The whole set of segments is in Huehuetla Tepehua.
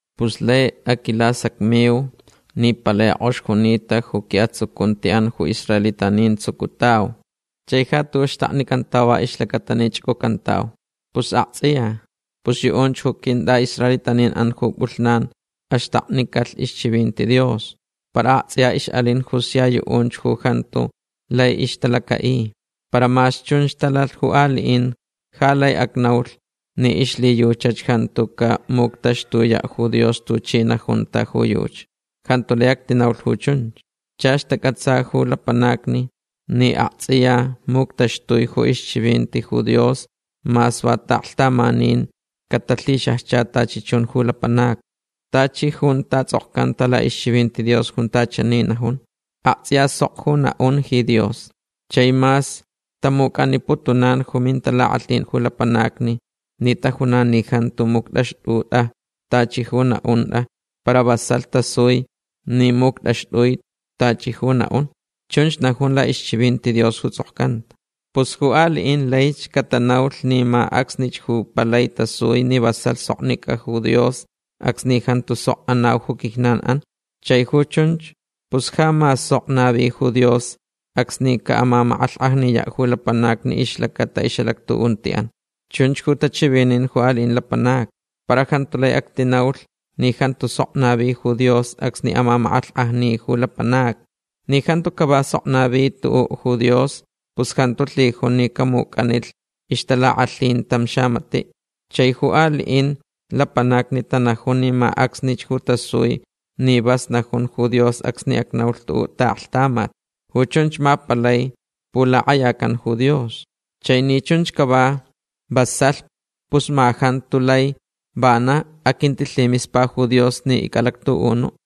Pus laich aquilasacmiuch ni palai kʼox junita ju quiʼatsucuntiʼan ju israelitanin tsucutauch. Chai ja tuʼuʼ xtaknicantauch va ixlacata ni chʼucʼucantauch. Pus aktsʼiya. Pus yuʼunch ju quintʼaʼisraelitanin ju pʼulhnan axtaknicalh ixchivinti Dios. Para aktsʼiya ixʼalin ju sia yuʼunch ju jantu lai ixtalacaʼi. Para mas chunch talalh ju aliʼin ja laich acnaulh ni ixlhiyuchach jantu camuctaxtuyaʼ ju Dios tuchi najuntach ju yuchi. Jantu lai actinaulh ju chunch. Chach tacʼatsa ju lapanacni ni aktsʼiya muctaxtui ju ixchivinti ju Dios mas va taʼaklhtamanin catalhixajcha tachi chun ju lapanacni. Tachi junta tsʼokcanta laʼixchivinti Dios junta chani najun: Aktsʼiya sok ju naʼun ji Dios. Chai mas tamucʼaniputunan ju mintalakʼalhin ju lapanacni ni tanajun ni jantu muctʼaxtʼutʼa tachi ju ixnaʼuntʼa para vasalh tasui ni muctʼaxtʼui tachi ju naʼun. Chunch najun laʼixchivinti Dios ju tsʼokcanta. Pus ju aliʼin laich catanaulh ni ma acsnich ju palai tasui ni vasalh soknicʼa ju Dios acsni jantu sok anau ju quijnanʼan. Chai ju chunch pus ja ma sok navi ju Dios acsni caʼamamakʼalhkʼajniyaʼ ju lapanacni ixlacata ixʼalactuʼuntiʼan. Chunch ju tachivinin ju aliʼin lapanacni. Para jantu lai actinaulh ni jantu sok navi ju Dios acsni amamakʼalhkʼajni ju lapanacni. Ni jantu cava sok navi tuʼuʼ ju Dios pus jantu lhijun ni camucʼanilh ixtalakʼalhin tam xamatiʼ. Chai ju aliʼin lapanacni tanajun ni ma acsnich ju tasui ni vas najun ju Dios acsni acnaulh tuʼuʼ taʼaklhtamat. Ju chunch ma palai pulakʼayacan ju Dios. Chai ni chunch cava vasalh pus ma jantu lai vanach aquintilhimispa ju Dios ni icʼalactuʼunuʼ.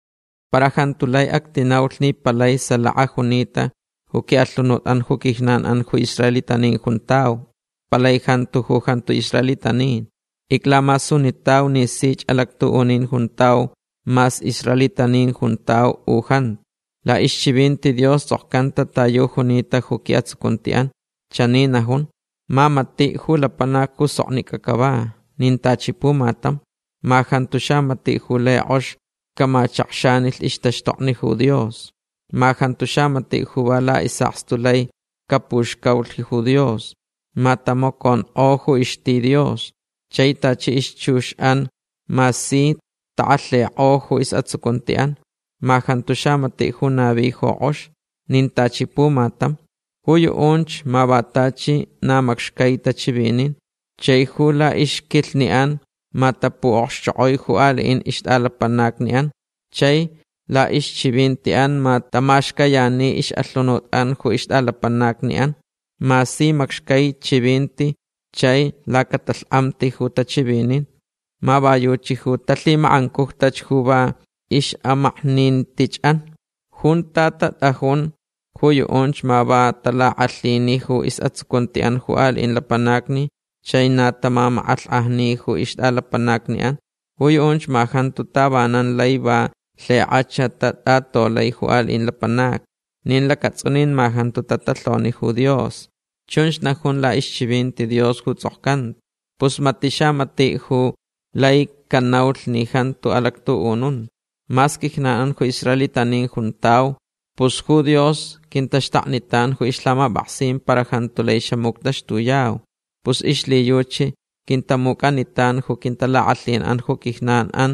Para jantu lai actinaulh ni palai salaka junita ju quiʼalhunutʼan ju quijnanʼan ju israelitanin juntau. Palai jantu ju jantu israelitanin. Iclamasunitauch ni sich alactuʼunin juntau mas israelitanin juntau u jantu. Laʼixchivinti Dios tsʼokcanta ta yu junita ju quiʼatsucuntiʼan. Chani najun: Ma matiʼ ju lapanac ju soknicʼa cava. Nin tachi pumatam. Ma jantu xamatiʼ ju lai kʼox camachakxanilh ixtaxtokni ju Dios. Ma jantu xamatiʼ ju va laʼisʼakstu lai capuxcaulh ju Dios. Ma tamaconkʼo ju ixti Dios. Chai tachi ixchuxʼan ma si takʼalhikʼo ju isʼatsucuntiʼan. Ma jantu xamatiʼ ju navi ju kʼox. Nin tachi pumatam. Ju yuʼunch ma va tachi na macxcai tachivinin. Chai ju laʼixquilhniʼan ma tapuʼokxchokʼoi ju aliʼin ixtʼalapanacniʼan. Chai laʼixchivintiʼan ma tamaxcayani ixʼalhunutʼan ju ixtʼalapanacniʼan. Ma si macxcai chivinti chai lacatalhkʼamti ju tachivinin. Ma va yuchi ju talhimakʼancujtach ju va ixʼamaknintichʼan. Junta tatʼajun ju yuʼunch ma na talakʼalhini ju isʼatsucuntiʼan ju aliʼin lapanacni chai na tamamakʼalhkʼajni ju ixtʼalapanacniʼan. Ju yuʼunch ma jantu tavanan lai va lhikʼachach tatʼatolai ju aliʼin lapanacni. Nin lacatsʼunin ma jantu tatalhoni ju Dios. Chunch najun laʼixchivinti Dios ju tsʼokcanta. Pus matiʼ xamatiʼ ju lai canaulh ni jantu alactuʼununta. Mas quijnanʼan ju israelitanin juntau. Pus ju Dios quintaxtaknitan ju ixlhamapʼaksin para jantu lai xamuctaxtuyau. Pus ixlhiyuchi quintamucʼanitan ju quintalakʼalhinʼan ju quijnanʼan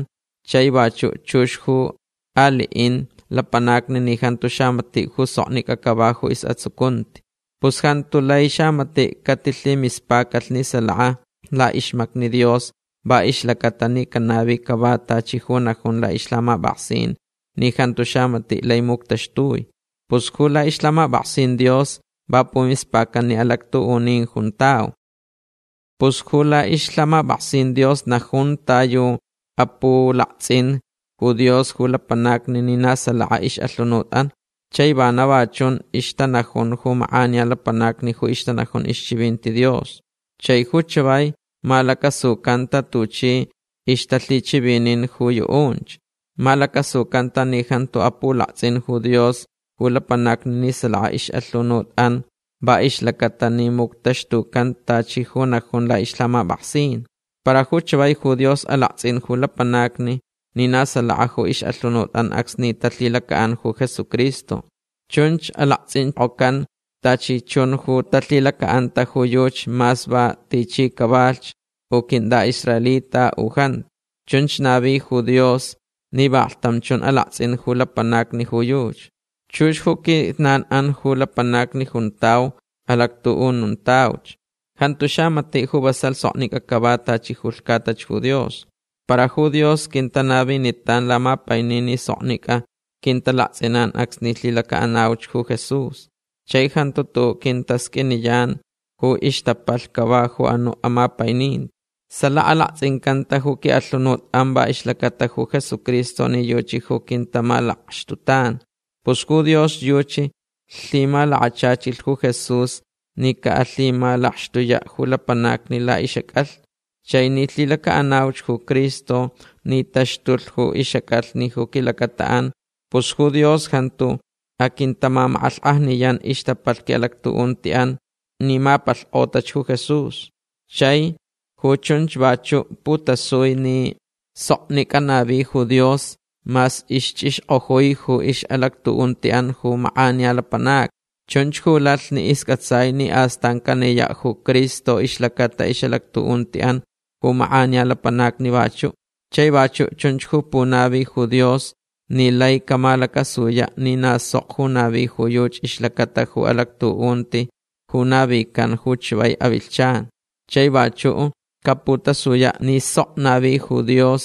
chai vachuʼ chux ju aliʼin lapanacni ni jantu xamatiʼ ju soknicʼa cava ju isʼatsucunti. Pus jantu lai xamatiʼ catilhimispacalh ni salaka laʼixmacni Dios va ixlacaʼatalh ni canavi cava tachi ju najun laʼixlhamapʼaksin ni jantu xamatiʼ lai muctaxtui. Pus ju laʼixlhamapʼaksin Dios va pumispacan ni alactuʼunin juntau. Pus ju laʼixlhamapʼaksin Dios najun ta yu apulaktsʼinch ju Dios ju lapanacni ni na salaka ixʼalhunutʼan. Chai vana va chun ixtanajun ju makʼaniya lapanacni ju ixtanajun ixchivinti Dios. Chai ju chavai malacasucanta tuchi ixtalhichivinin ju yuʼunch. Malacasucanta ni jantu apulaktsʼin ju Dios ju lapanacni ni salaka ixʼalhunutʼan va ixlacaʼatalh ni muctaxtucan tachi ju najun laʼixlhamapʼaksin. Para ju chavai ju Dios alaktsʼin ju lapanacni ni na salaka ju ixʼalhunutʼan acsni talhilacaʼan ju Jesucristo. Chunch alaktsʼinkʼocan tachi chun ju talhilacaʼanta ju yuchi mas va tichi cavalhch u quintʼaʼisraelita u jantu. Chunch navi ju Dios ni vaklhtam chun alaktsʼin ju lapanacni ju yuchi. Chux ju quijnanʼan ju lapanacni juntau alactuʼununtauch. Jantu xamatiʼ ju vasalh soknicʼa cava tachi ju lhcatach ju Dios. Para ju Dios quintanavinitan lamapainin ni soknicʼa quintalaktsʼinan acsni lhilacaʼanauch ju Jesús. Chai jantu tuʼuʼ quintasqʼuiniyan ju ixtapalh cava ju anuʼ amapaininti. Salaka alaktsʼincantach ju quiʼalhunutʼan va ixlacata ju Jesucristo ni yuchi ju quintamalakxtutan. Pus ju Dios yuchi lhimalakachachilh ju Jesús ni caʼalhimalakxtuyaʼ ju lapanacni laʼixʼacʼalhni. Chai ni lhilacaʼanauch ju Cristo ni taxtulh ju ixʼacʼalhni ju quilacataʼan pus ju Dios jantu aquintamamakʼalhkʼajniyan ixtapalh quiʼalactuʼuntiʼan ni mapalhkʼotach ju Jesús. Chai ju chunch vachuʼ putasui ni soknicʼa navi ju Dios mas ixchʼixkʼojui ju ixʼalactuʼuntiʼan ju makʼaniya lapanacni. Chunch ju lalh ni iscʼatsai ni astan caniyaʼ ju Cristo ixlacata ixʼalactuʼuntiʼan ju makʼaniya lapanacni vachuʼ. Chai vachuʼ chunch ju punavita ju Dios ni laich camalacasuyaʼ ni na sok ju navi ju yuchi ixlacata ju alactuʼunti ju navican ju chavai avilhchan. Chai vachuʼ caputasuyach ni sok navi ju Dios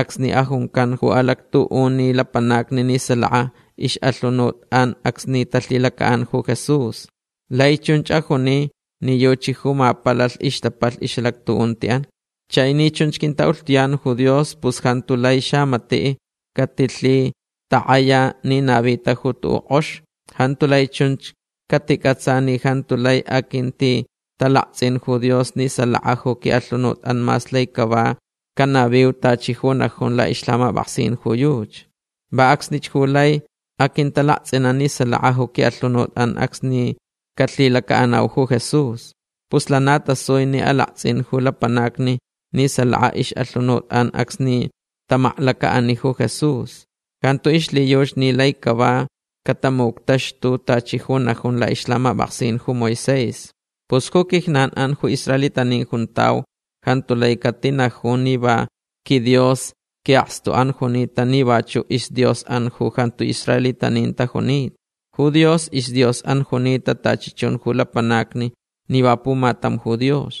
acsni ajuncan ju alactuʼuni lapanacni ni salaka ixʼalhunutʼan acsni talhilacaʼan ju Jesús. Lai chunch ajuni ni yuchi ju mapalalh ixtapalh ixʼalactuʼuntiʼan. Chai ni chunch quintaʼulhtuyan ju Dios pus jantu lai xamatiʼ catilhitakʼaya ni navita ju tuʼuʼ kʼox. Jantu lai chun caticʼatsa ni jantu lai aquintitalaktsʼin ju Dios ni salaka ju quiʼalhunutʼan mas lai cava canaviu tachi ju najun laʼixlhamapʼaksin ju yuchi. Va acsnich ju laich aquintalaktsʼinan ni salaka ju quiʼalhunutʼan acsni calhilacaʼanau ju Jesús. Pus lana tasui ni alaktsʼin ju lapanacni ni salaka ixʼalhunutʼan acsni tamaklacaʼani ju Jesús. Jantu ixlhiyuchi ni lai cava catamuctaxtulhch tachi ju najun laʼixlhamapʼaksin ju Moisés. Pus ju quijnanʼan ju israelitanin juntau jantu lai catinaju ni va quiDios quiʼakstuʼan junita ni vachuʼ isDiosʼan ju jantu israelitanin tajunita. Ju Dios isDiosʼan junita tachi chun ju lapanacni ni va pumatam ju Dios.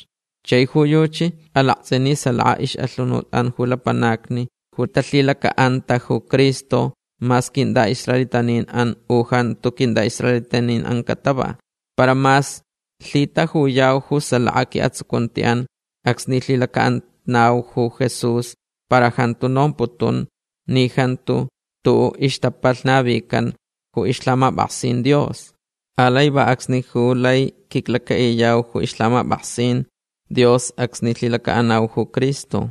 Chai ju yuchi alaktsʼin ni salaka ixʼalhunutʼan ju lapanacni ju talhilacaʼanta ju Cristo mas quintʼaʼisraelitanin u jantu quintʼaʼisraelitanin catava. Para mas lhitajuyau ju salaka quiʼatsucuntiʼan acsni lhilacaʼanauch ju Jesús para jantu nomputun ni jantu xtuʼuʼ ixtapalh navican ju ixlhamapʼaksin Dios. Alai va acsni ju lai quiclacaʼiyau ju ixlhamapʼaksin Dios acsni lhilacaʼanau ju Cristo.